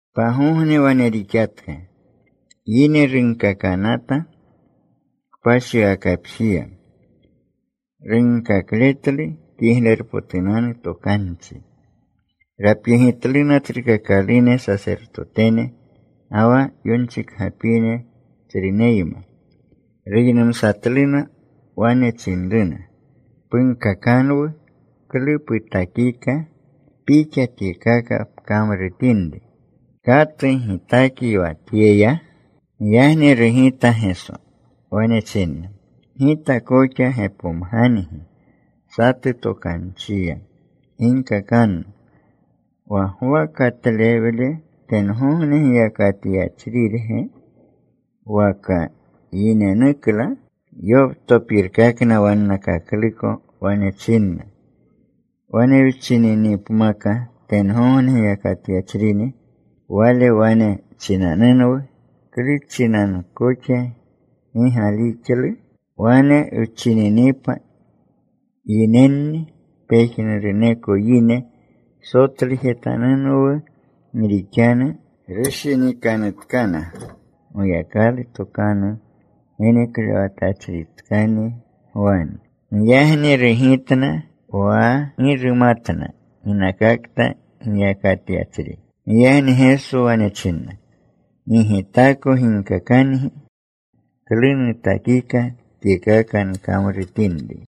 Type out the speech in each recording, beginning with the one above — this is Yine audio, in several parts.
Pagogne wane rixatka. Yine runkakanata kpashiwakapjiya. Runkakletlu Kiglerpotunanu Tokanchi. Rapyegitluna tsrukakalune sasertotene, ga wa yonchikgapine tsruneyma. Ruynumsatluna. Wane chinruna, “Punkakanwu klu putakika Pixa tyekaka pkamrutinri. ¿Katu gitakyi wa tyeya?” Giyagni rugita Geso. Wane chinna, “Gita koxa gepomgangi satu tokanchiya. Ginkakanno. Wa Gwa katlewle ¿tengogne giyakatyachrirge? ¿Waka yinenukla?” Yoptopirkakna wannakakluko. Wane chinna, “Wane wchininipmaka, tengogne giyakatyachrini, Wale wane chinanunwu, ‘¿Klu chinanu koxa gi galixlu?’ Wane wchinininapa yinenni, pejnuruneko yine sotlujetanunwu. Gi rixanu rushinikanutkana Goyakalu tokanu geneklewatachritkani Gwani.” Giyagni rugitna wa gi rumatna ginakakta giyakatyachri. Giyagni Geso wane chinna, “Gi Gitako ginkakangi klu nutakika tyekaka nkamrutinri.”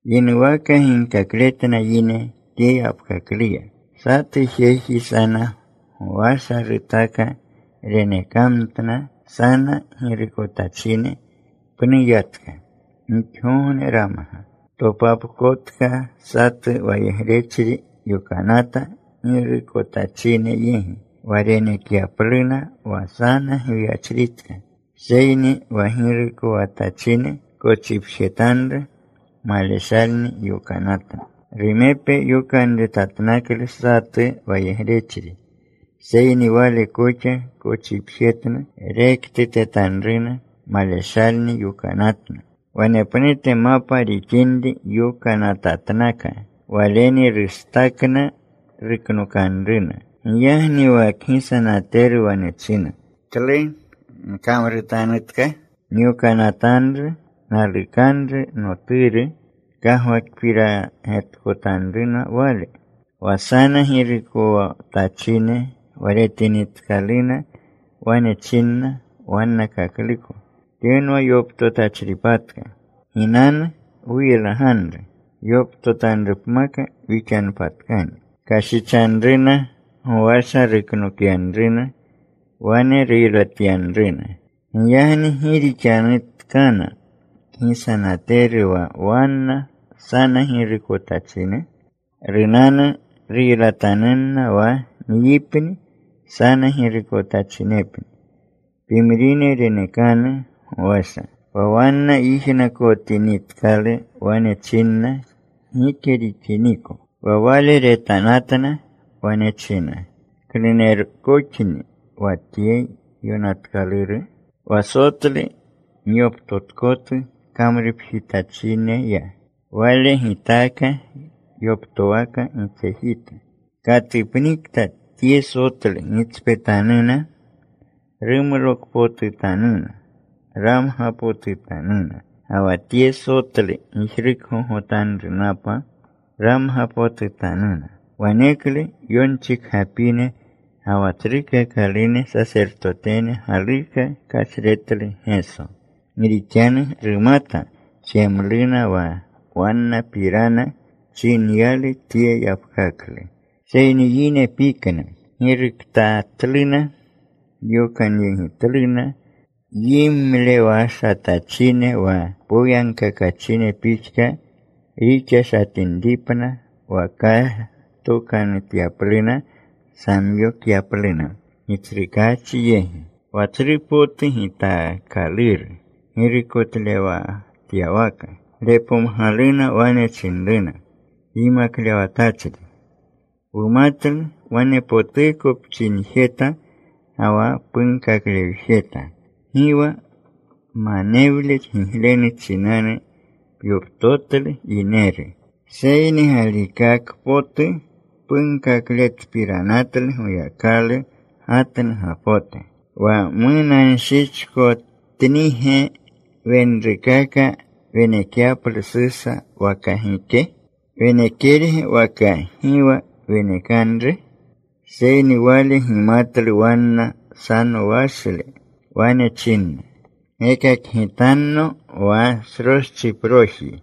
Yinuwaka ginkakletna yine tye yapkakluya, “Satu jeji sana gowasha rutaka. Renekamtna sana girukotachine. Pnu yatka. Gixgogne ramga. Topapkotka satu wayegrechri yokanata girukotachine yegi, wa renekyapluna wa sana gwiyachritka. Seyni wa girukowatachine kochipjetanru. Maleshalni yokanatna. Rumepe yokanretatnaklu satu wayegrechri. Seyni wale koxa kochipjetna. Rektutetanruna. Maleshalni yokanatna. Wanepnute mapa rixinri yokanatatnaka. Waleni rustakna. Ruknokanruna. “Giyagni wa kgisanateru wane china, ‘¿Klu nkamrutanutka? Nyokanatanru nalukanru noturu. Kagwakpirgetkotanruna wale.’ “Wa sana girukotachine wa retinitkaluna, wane chinna wannakakluko, ‘Tyenwa yoptotachripatka. Ginanu. Wuylaganru. Yoptotanrupmaka wixanpatkani.’ “Kashichanruna. Gowasha ruknokyanruna. Wane ruylatyanruna. “Giyagni ¿gi rixanutkana kgisanateru wa wanna sana girukotachine? Runanu. Ruylatanunna wa nyipni sana girukotachinepni. Pimrine renekanu gowasha.” Wa wanna yijnakotinitkalu, wane chinna, “Gike rixiniko.” Wa Wale retanatna. Wane china, “¿Klunerkoxni wa tye yonatkaluru? Wa sotlu myoptotkotu kamrupjitachineya, wale gitaaka yoptowaka gitsejita. “Katupnikta tye sotlu gitspetanuna, rumlokpotutanuna, ramgapotutanuna. Ga wa tye sotlu gijrukgogotanrunapa ramgapotutanuna.” Waneklu yonchikgapine ga wa tsrukakalune sasertotene galuka kashretlu Geso, gi rixanu rumata jemluna wa wannapirana chinyalu tye yapkaklu. Seyni yine pikna. Giruktatluna. Yokanyegitluna yimlewashatachine, wa poyagkakachine pixka rixashatinripna, wa kashtokanutyapluna, samyokyapluna gitsrukaachi yegi, wa tsru potu gitaakaluru girukotlewatyawaka. Repomgaluna. Wane chinruna, “Yimaklewatachri, wumatlu wanepotuko pchinjeta ga wa punkaklewjeta. Gi wa manewle giglenu chinanu pyoptotlu yineru. Seyni galikaka potu punkakletpiranatlu Goyakalu gatnugapote. ¿Wa munanshichkotnige wenrukaka wenekyaplu Susa waka gike? ¿Wenekerge waka gi wa wenekanru?” Seyni Wale gimatlu wanna sanowashle. Wane chinna, “Gekakgitanno wa sroschiproji.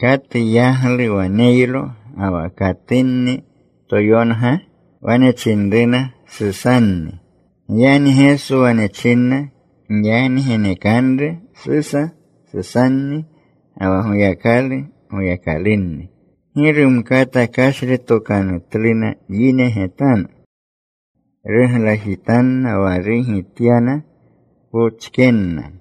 ¿Katu yaglu waneylo, ga wa katunni toyonga?” Wane chinruna, “Susanni.” Giyagni Geso wane chinna, “Giyagni genekanru Susa Susanni, ga wa Goyakalu Goyakalunni.” Gi rumkata kashretokanutluna yine getanu. Ruglajitanna wa rugityana. Pochkenna.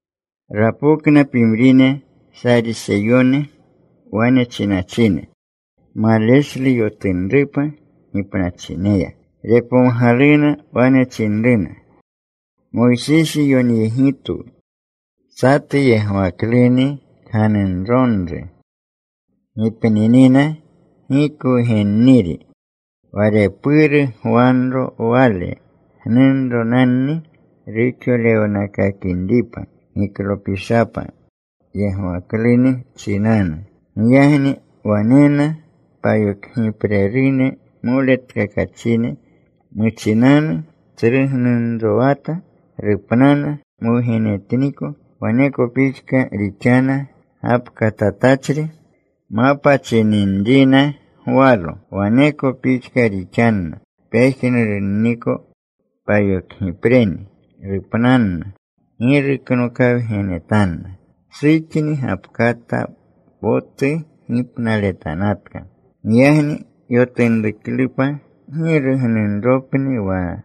Rapokna pimrine Sariseyone. Wane chinachine maleshlu yotunrupa gipnachineya. Repomgaluna. Wane chinruna, “Moysisi yonyegitwu, satu yegwakluni kganunronru gipninina gi kwugenniri, wa repuru gwanro wale gnunronanni ruxolewkakinripa giklopishapa yegwakluni chinanu. Giyagni wanena payokgiprerune moletkakachine. Muchinanu tsru gnunrowata. Rupnana. Mwugenetniko. Waneko pixka rixana gapkatatachri. Mapa chininrina gwalo. Waneko pixka rixanna pejnurunniko payokgipreni. Rupnanna. Gi ruknokawgenetanna. Suxni gapkata potu gipnaletanatka. Giyagni yotunruklupa, ¿giru gnunropni wa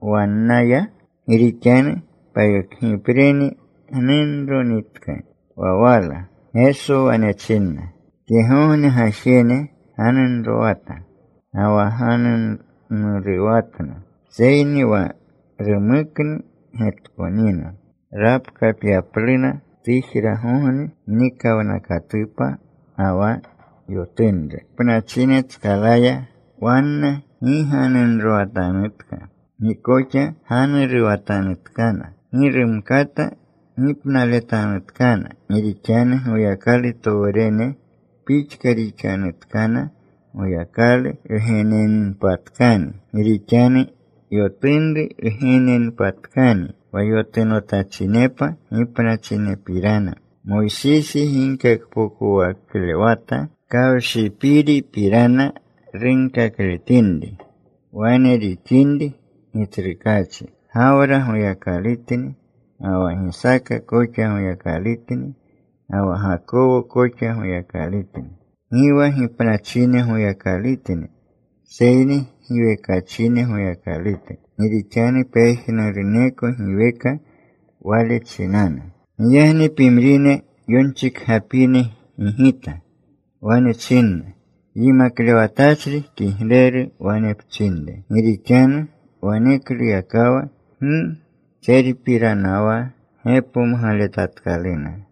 wannaya? Gi rixanu payokgipreni gnunronitka wa wala.” Geso wane chinna, “Tyegogne gajene ganunrowata ga wa ganuruwatna. Seyni wa rumuknu getkonina rapkapyapluna tujragogne mnikawnakatupa ga wa yotunru gipnachinetskalaya wanna gi ganunrowatanutka. Gi koxa ganuruwatanutkana. Gi rumkata gipnaletanutkana. Gi rixanu Goyakalutowrene pixka rixanutkana. Goyakalu wgenenpatkani, gi rixanu yotunru wgenenpatkani. Wa yotunotachinepa gipnachinepirana, Moysisi ginkakpokowaklewata kawshipiripirana runkakletinri, wane rixinri Gitsrukaachi, Gawra Goyakalutni, ga wa Gisaaka koxa Goyakalutni, ga wa Gakowo koxa Goyakalutni. Gi wa gipnachine Goyakalutni, seyni giwekachine Goyakalute. Gi rixanu pejnuruneko giweka Wale chinanu.” Giyagni pimrine yonchikgapine gigita. Wane chinna, “Yimaklewatachri, kigleru wane pchinre.” Gi rixanu wanekluyakawa gi tserpiranawa gepomgaletatkaluna.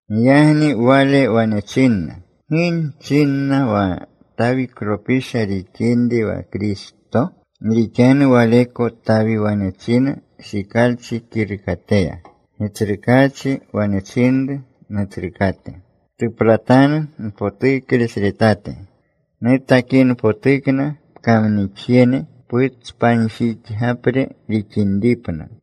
Giyagni Wale wane chinna, “¿Gi chinna wa Tawiklopisha rixinri wa Kristo? Gi rixanu waleko Tawi wane china Shikalchi kirukateya: Gitsrukaachi wane chinru Nutsrukate: ‘Ptuplatanu npotuklesretate, Nutakinpotukna pkamnixjene putspanjixgapre rixinripna.’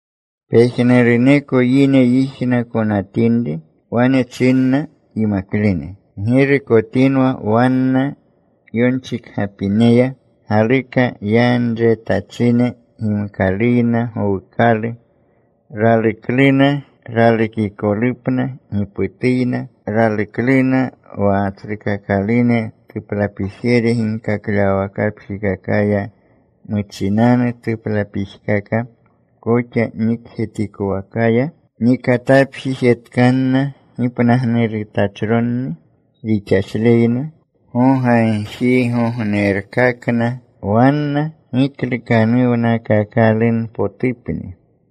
Pejnuruneko yine yijnakonatinri, wane chinna yimaklene, “Ggirukotinwa wanna yonchikgapineya. Galuka yanretachine gimkaluyna gowukalu. Ralukluna ralukikolupna giputuyna. Ralukluna wa tsrukakalune tuplapijere ginkaklewawakapjikakaya, muchinanu tuplapijkaka koxa nikjetikowakaya. Nikatapjijetkanna gipnagnurutachronni. Rixashleyna gogagjirgognerkakna. Wanna giklukanuwnakakalunpotupni.”